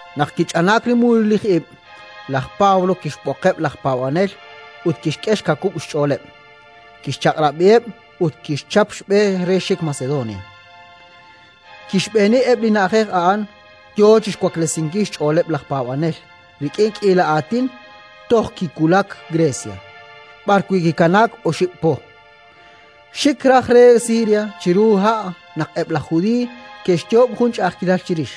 Naq kich'anaak li mululij ib', laj Pablo kixb'oqeb' laj paab'anel ut kixk'e xkawub' xch'ooleb'; kixchaq'rab'iheb' ut kixchap xb'e re xik Macedonia. Kixb'eeni eb' li na'ajej a'an, yo chi xwaklesinkil xch'ooleb' laj paab'anel rik'in k'iila aatin, toj kiwulak Grecia, b'arwi' kikanaak oxib' po. Xik raj re Siria chiru ha' naq eb' laj Judiiy ke'xyoob' jun ch'a'ajkilal chirix.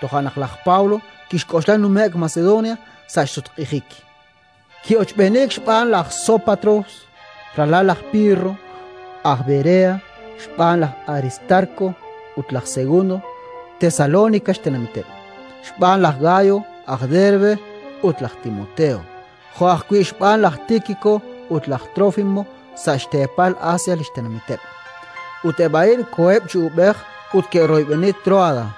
Toja' naq laj Pablo kixk'oxla nume'k Macedonia sa' xsutq'ijik. Ki'ochb'eeniik xb'aan laj Sópatros, ralal laj Pirro, aj Berea; xb'aan laj Aristarko ut laj Segundo, Tesalónika xtenamiteb'; xb'aan laj Gayo aj Derbe ut laj Timoteo, jo' ajwi' xb'aan laj Tíkiko ut laj Trófimo, sa' xteepal Asia li xtenamiteb'. Eb' a'in koheb' chi uub'ej ut koxe'royb'eni Tróada.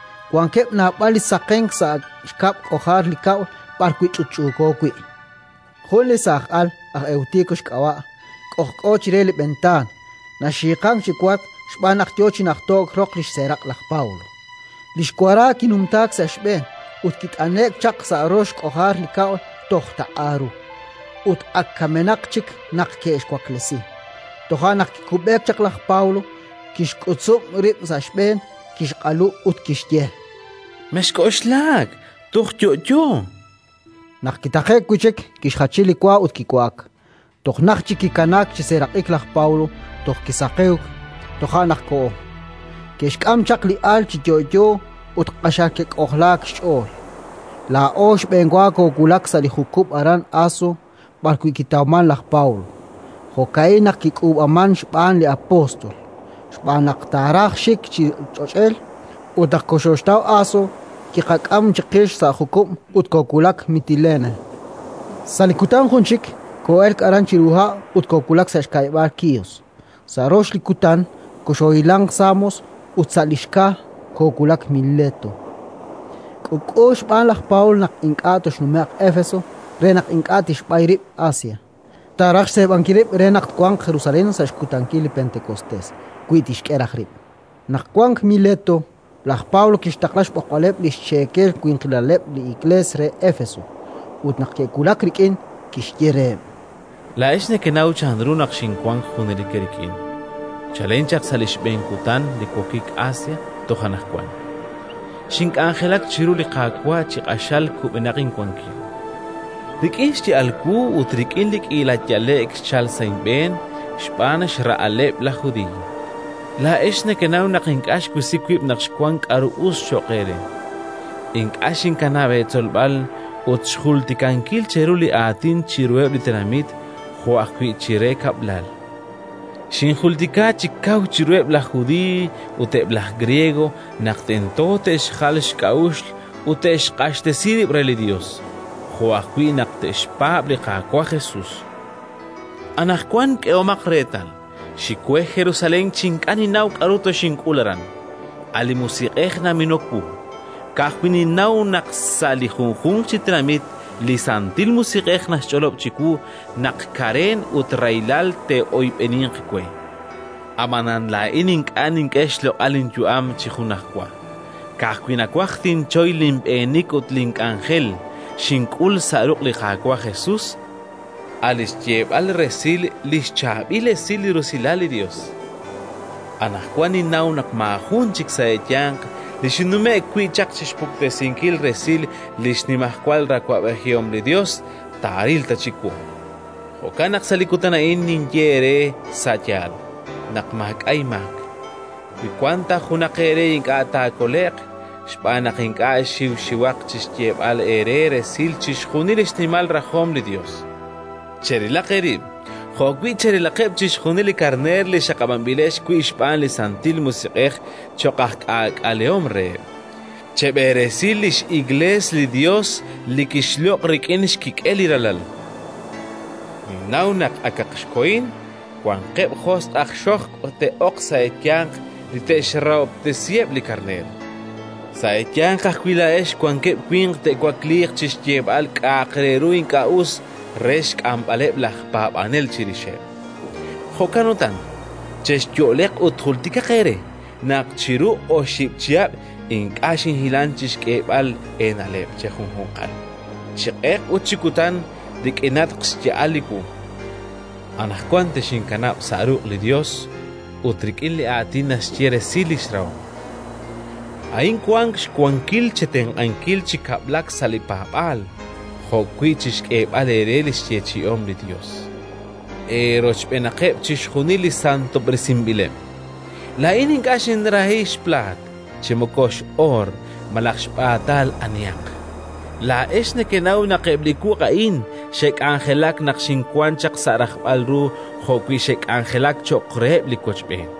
Wankeb' naab'al li saqenk sa' xkab' k'ojar li kab'l b'ar ch'utch'uuko wi'. Jun li saaj al, aj Ewtiko xk'ab'a', k'ojk'o chire li b'entaan, naxiiqan chi wark xb'aan naq yo chi najto'k roq li xseeraq' laj Pablo. Li xwara kinumtaak sa' xb'een ut kit'ane'k chaq sa' rox k'ojar li kab'l toj taq'a ru: ut ak kamenaq chik naq ke'xwaklesi. Toja' naq kikub'e chaq laj Pablo, kixk'utzub' rib' sa' xb'een, kixq'alu ut kixye: —Mexk'oxlak, toj yo'yo. Naq kitaqe'k wi' chik, kixjachi li wa ut kiwa'ak. Toj najt chik kikanaak chi seeraq'ik laj Pablo, toj kisaqewk; toja' naq koho. Ke'xk'am chaq li al chi yo'yo, ut q'axal ke'k'ojlaak xch'ool. Laa'o xb'enwa koowulak sa' li jukub' aran Aso, b'arwi' kiqataw laj Pablo. Jo'ka'in naq kik'uub'aak xb'aan li apóstol, xb'aan naq taaraj xik chi ch'och'el. Ut naq koxoxtaw Aso, kiqak'am chiqix sa' jukub' ut koowulak Mitilene. Sa' li kutan jun chik koo'elk aran chiru ha' ut koowulak sa' xka'yab'aal Kíos; sa' rox li kutan koxoohilanq Samos ut sa' li xka koowulak Mileto. K'uub'k'u xb'aan laj Pablo naq ink'a' toxnume'q Éfeso re naq ink'a' tixb'ay rib' Asia; taaraj xseeb'ankil rib' re naq twanq Jerusalén sa' xkutankil li Pentekostés, wi tixk'e raj rib'. Naq wank Mileto, laj Pablo kixtaqla xb'oqb'aleb' li xcheekel winqilaleb' li Iklees re Éfeso. Ut naq ke'wulak rik'in, kixye reheb': “Laa'ex nekenaw chanru naq xinwank junelik eerik'in, chalen chaq sa' li xb'een kutan li wokik Asia toj anaqwan. Xink'anjelak chiru li Qaawa' chi q'axal kub'enaq inwankil, rik'in xya'al wu ut rik'in li k'iila yale'k xchalk sa' inb'een xb'aan xra'aleb' laj Judiiy. Laa'ex nekenaw naq ink'a' xwisi wib' naq xwank k'aru us cho'q eere: ink'a' xinkanab' eetzolb'al ut xjultikankil cheru li Aatin chiruheb' li tenamit jo' ajwi' chire kab'lal; xinjultika chi kaw chiruheb' laj Judiiy ut eb' laj Griego naq tento te'xjal xk'a'uxl ut te'xq'axtesi rib' re li Yos, jo' ajwi' naq te'xpaab' li Qaawa' Jesus. Anaqwan, k'ehomaq reetal, xik we Jerusalén chi ink'a' ninnaw k'aru toxink'ul aran. A' li Musiq'ej naminok wu. Ka'ajwi' ninnaw naq sa' li junjunq chi tenamit li Santil Musiq'ej naxch'olob' chiwu naq kareen ut rahilal te'oyb'eninq we. Ab'anan laa'in ink'a' nink'e xloq'al linyu'am chi junajwa; ka'ajwi' nawaj tinchoy linb'eenik ut li k'anjel xink'ul sa' ruq' li Qaawa' Jesus, a' li xyeeb'al resil li xChaab'il Esil li rusilal li Yos. “Anaqwan ninnaw naq maajun chik sa' eeyanq, li xinnumje'k wi' chi xpuktesinkil resil li xnimajwal awab'ejihom li Yos, taaril ta chik wu. Jo'kan naq sa' li kutan a'in tinye eere sa' yaal naq maak'a' inmaak, wi wanq ta junaq eere ink'a' taakole'q, xb'aan naq ink'a' xinxiwak chi xyeeb'al eere resil chixjunil li xnimal rajom li Yos. Cherilaq eerib' jo' ajwi' cherilaqeb' chixjunil li karneer li xaqab'anb'ilex wi' xb'aan li Santil Musiq'ej cho'q aj k'aak'alehom reheb'. Cheb'eresi li x'Iklees li Yos li kixloq' rik'in xkik'el li Ralal. Ninnaw naq, akaq xkohin, wanqeb' josq' aj xojb' te'ok sa' eeyanq li te'xrahob'tesi eb' li karneer. Sa' eeyanq ajwi' laa'ex wanqeb' winq te'wakliiq chi xyeeb'al k'a'aq re ru ink'a' us re xk'amb'aleb' laj paab'anel chirixeb'. Jo'kan utan, chexyo'leq ut jultikaq eere naq chiru oxib' chihab' ink'a' xinhilank chi xk'eeb'al eena'leb' chejunjunqal, chi q'eq ut chi kutan, rik'inatq xya'al wu. “Anaqwan texinkanab' sa' ruq' li Yos ut rik'in li Aatin naxye resil li xrahom: a'in wank xwankil chetenq'ankil chi kab'laak sa' li paab'aal jo' ajwi' chi xk'eeb'al eere li xyeechi'om li Yos, eerochb'eenaqeb' chixjunil li santob'resinb'ileb'. Laa'in ink'a' xinrahi xplaat, chi moko x'oor malaj xb'aatal anihaq. Laa'ex nekenaw naq eb' li wuq' a'in xe'k'anjelak naq xinwank sa' rajb'al ru jo'wi' xe'k'anjelak cho'q reheb' li wochb'een.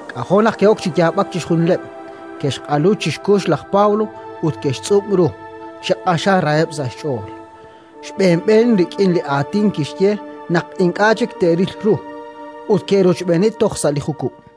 K'ajo' naq ke'ok chi yaab'ak chixjunileb', ke'xq'alu chi xkux laj Pablo ut ke'xtz'ub' ru chi q'axal raheb' sa' xch'ool, xb'een xb'een rik'in li aatin kixye naq ink'a' chik te'ril ru. Ut ke'rochb'eeni toj sa' li jukub'.